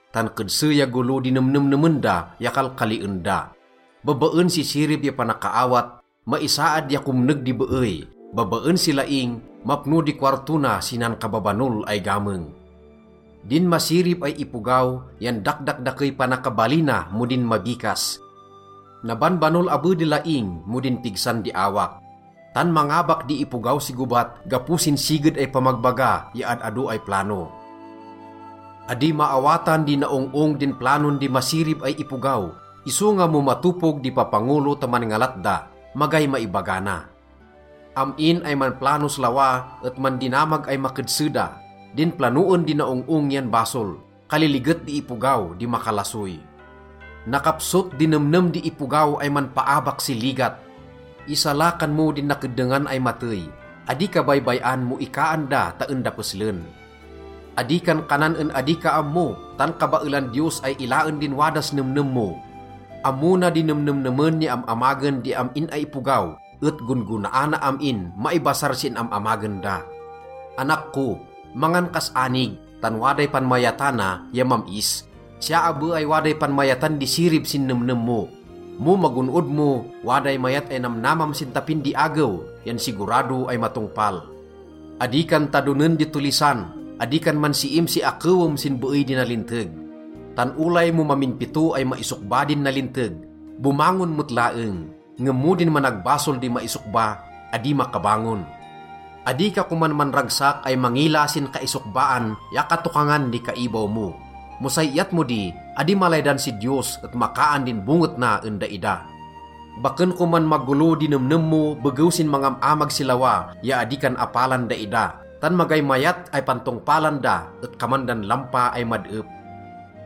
tan kedse ya golo di nemnemnemen da ya kalkalien da. Babaen si sirib ya panakaawat, maisaad ya komneg di beey. Babaen si laing, mapno di kowarto na si nankababanol ay gameng. Din masirib ay ipogaw yan dakdakdakey panakabalina mo din mabikas. Nabanbanol abe di laing mo din pigsan di awak. Tan mangabak di ipogaw si gobat gapo sin siged ay pamagbaga ya ad-ado ay plano. Adi maawatan di naong-ong din planon di masirib ay ipogaw, isonga mo matopog di papangolo ta manngalat da, magay maibaga na. Am-in ay manplanos lawa et mandinamag ay makedse da. Din planoen di naong-ong yan basol. Kaliliget di ipogaw di makalasoy. Nakapsot di nemnem di ipogaw ay manpaabak si ligat. Isalakan mo din nakeddengan ay matey. Adi ka baybay-an mo ikaan da ta en da peslen. Adi kan kanan en adi ka ammo, tan kabaelan Diyos ay ilaen din wadas nemnem mo. Ammo na di nemnemnemen ya am-amagen di am-in ay ipogaw et gon-gonaana am-in maibasar sin am-amagen da. Anak ko, mangan kas anig, tan waday panmayatana ya mam-is. Siya abe ay waday panmayatan di sirib sin nemnem mo. Mo magon-od mo, waday mayat ay namnamam sin tapin di agew yan sigurado ay matongpal. Adi kan tadonen di tollisan. Adi kan mansiim si akewem sin beey di nalinteg. Tan olay mo mamin pito ay maisokba din nalinteg, bomangon met laeng. Ngem mo din managbasol di maisokba, adi makabangon. Adi ka koman manragsak ay mangila sin kaisokbaan ya katokangan di kaibaw mo. Mo say iyat mo di, adi malaydan si Diyos et makaan din bonget na en daida. Baken koman magolo di nemnem mo begew sin mangam-amag si lawa ya adi kan apalan daida. Tan magay mayat ay pantongpalan da et kaman dan lampa ay mad-ep.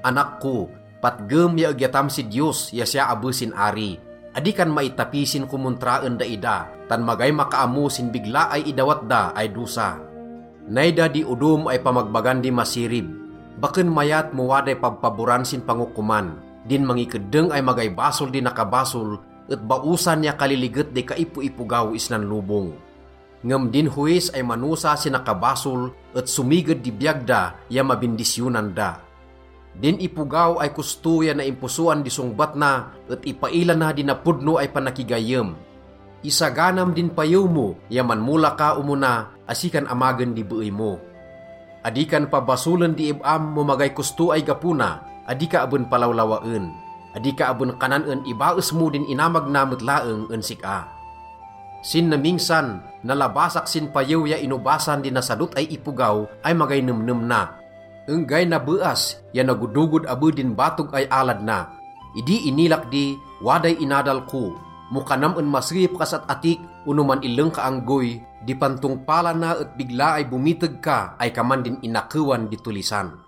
Anak ko, patgem ya egyatam si Diyos ya siya abe sin ari. Adi kan maitapi sin komontra en daida. Tan magay makaammo sin bigla ay idawat da ay dosa. Nay da di odom ay pamagbagan di masirib. Baken mayat mo waday pabpaboran sin pangokoman. Din mangikeddeng ay magay basol di nakabasol et baosan ya kaliliget di kaipoipogaw isnan lobong. Ngem din howis ay manosa si nakabasol et somiged di biyag da ya mabindisyonan da. Din ipogaw ay kosto ya naimposoan di songbat na et ipaila na di napodno ay panakigayyem. Isaganam din payew mo ya manmola ka omona asi kan amagen di beey mo. Adi kan pabasolen di ib-am mo magay kosto ay gapo na, adi ka aben palawlawaen. Adi ka aben kanan en ibaes mo din inamag na met laeng en sik-a. Sin namingsan, nalabasak sin payew ya inobasan di nasadot ay ipogaw ay magay nemnem na. Enggay nabeas ya nagodogod abe din batog ay alad na. Idi inilak di, waday inadal ko. Mo kanam en maseyep kas at-atik ono man-illeng ka anggoy, di pantongpalana et bigla ay bomiteg ka ay kaman din inakewan di tollisan.